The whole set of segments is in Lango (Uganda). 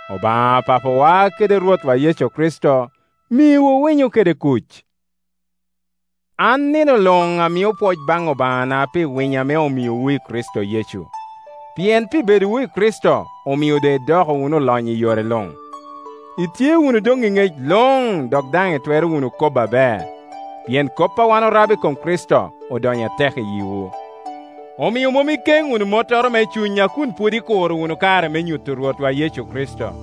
Obaŋa Papawa kede Rwotwa Yecu Kricito miwu winyo kede kuc. An nino luŋ amio pwoc baŋ Obaŋana pi winyo ame omiowu i Kricito Yecu, pien pi bedowu i Kricito omio doŋ idoko wunu olonyo i yore luŋ, Itye wunu doŋ i ŋec luŋ dok daŋ itwero kobo wunu aber, pien kop a wan orabo i kom Kricito odonyo atek i yiwu. Omio mom ikeŋ wunu mottoro me cuny a kun pwod ikuro wunu kare me nyuto Rwotwa Yecu Kricito.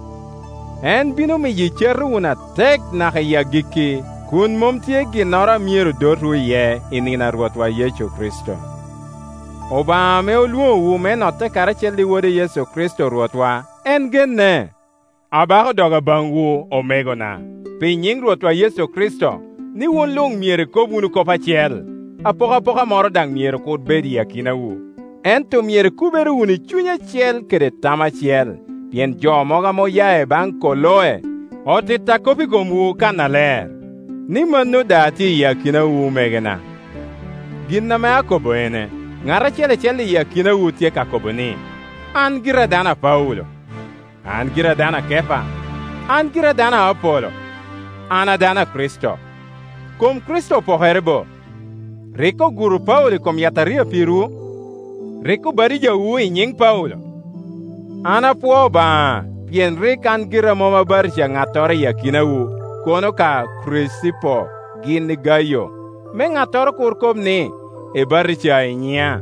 En bino miyo icato wunu atek naka iyi agikki, kun mom tye ginnoro a myero dotwu iye i nino a Rwotwa Yecu Kricito. Obaŋa ame olwoŋowu me notte karacel i Wode Yecu Kricito Rwotwa, en genne. Abako doga baŋwu, omegona, pi nyiŋ Rwotwa Yecu Kricito, ni wun luŋ myero ikob wunu kop acel, apokapoka moro daŋ myero kur bedo i akinawu; ento myero ikubere wunu i cuny acel kede tam acel. Pien jo mogo ame oya i baŋ Koloe otitta kop i komwu kannaler, ni mano daa tye i akinawu, omegona. Gin ame akobo ene: ŋat acel acel iyi akinawu tye ka kobo ni, “An gira a dano a Paulo”, “An gira a dano a Kepa”, “An gira a dano Apolo”, “An a dano a Kricito.” Kom Kricito opokere bo? Rik oguro Paulo i kom yataria pirwu? Rik obatijawu i nyiŋ Paulo? An apwoo Obaŋa, pien rik an gira mom abatija ŋattoro iyi akinawu, kono ka Kricipo gin i Gayo, me ŋattoro kur kob ni ebatija i nyiŋa.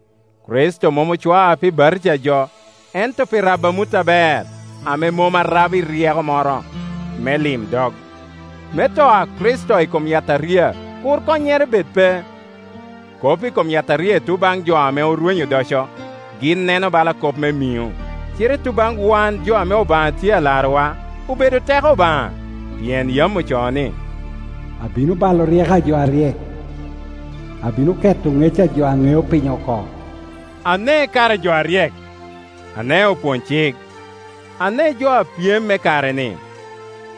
Kricito mom ocwaa pi batija jo, ento pi rabo amut aber, ame mom arabo i ryeko moro me limdog, me to a Kricito i kom yataria kur konnyere bed pe. Kop i kom yataria i tuŋ baŋ jo ame arwenyo odoco, gin neno bala kop me miŋo, cite i tuŋ baŋ wan jo ame Obaŋa tye alarowa, obedo teko Obaŋa. Pien yam ocoo ni, “Abino balo ryeko a jo aryek, abino keto ŋec a jo a ŋeo piny oko,” Ane kara jo aryek? Ane opwony-cik? Ane jo apyem me kare-ni?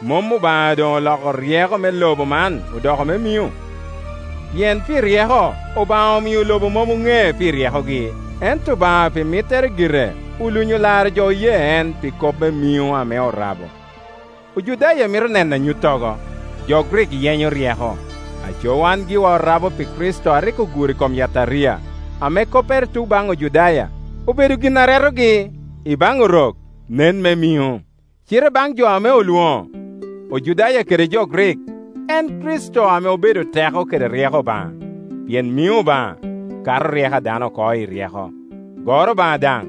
Mom Obaŋa doŋ oloko ryeko me lobo man odoko me miŋo? Pien pi ryeko Obaŋa omio lobo mom oŋee pi ryekogi, ento Obaŋa pi mittere gire olunyo laro jo oye en pi kop me miŋo ame orabo. Ojudaya mito neno anyuttogo, jo Grik yenyo ryeko; aco wan giwa orabo pi Kricito a rik oguro i kom yataria, ame koppere tuŋ baŋ Ojudaya obedo gin a retogi, i baŋ Orok nen me miŋo. Cite baŋ jo ame olwoŋo, Ojudaya kede jo Grik, en Kricito ame obedo teko kede ryeko Obaŋa. Pien miŋo Obaŋa kato ryeko a dano oko i ryeko, goro Obaŋa daŋ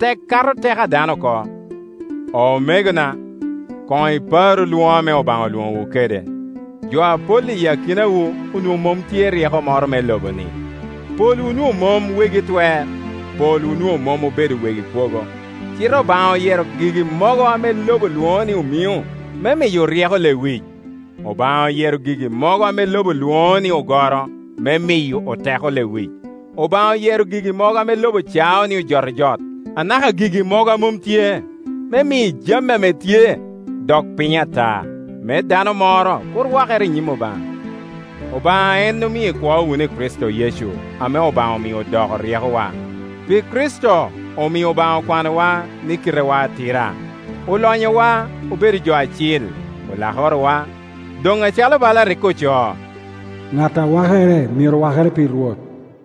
tek kato teko a dano oko. Omegona, koŋ iparu lwoŋo ame Obaŋa olwoŋowu kede. Jo apol i akinawu onwoŋo mom tye i ryeko moro me lobo-ni, polwu onwoŋo mom wegi twer, polwu onwoŋo mom obedo wegi kwogo. Cite Obaŋa oyero gigi mogo ame lobo lwoŋo ni omiŋo, me miyo oryeko lewic; Obaŋa oyero gigi mogo ame lobo lwoŋo ni ogoro, me miyo oteko lewic; Obaŋa oyero gigi mogo ame lobo cao ni ojotojot, anaka gigi mogo a mom tye, me mi jami a tye dok piny ata, me dano moro kur wakere i nyim Obaŋa. Obaŋa en omio ikwo wunu i Kricito Yecu, ame Obaŋa omio odoko ryekowa. Pi Kricito omio Obaŋa okwanowa ni kitewa atira, olonyowa obedo jo acil, olakorowa. Doŋ acalo bala rik ocoo, “Ŋat a wakere, myero wakere pi Rwot.”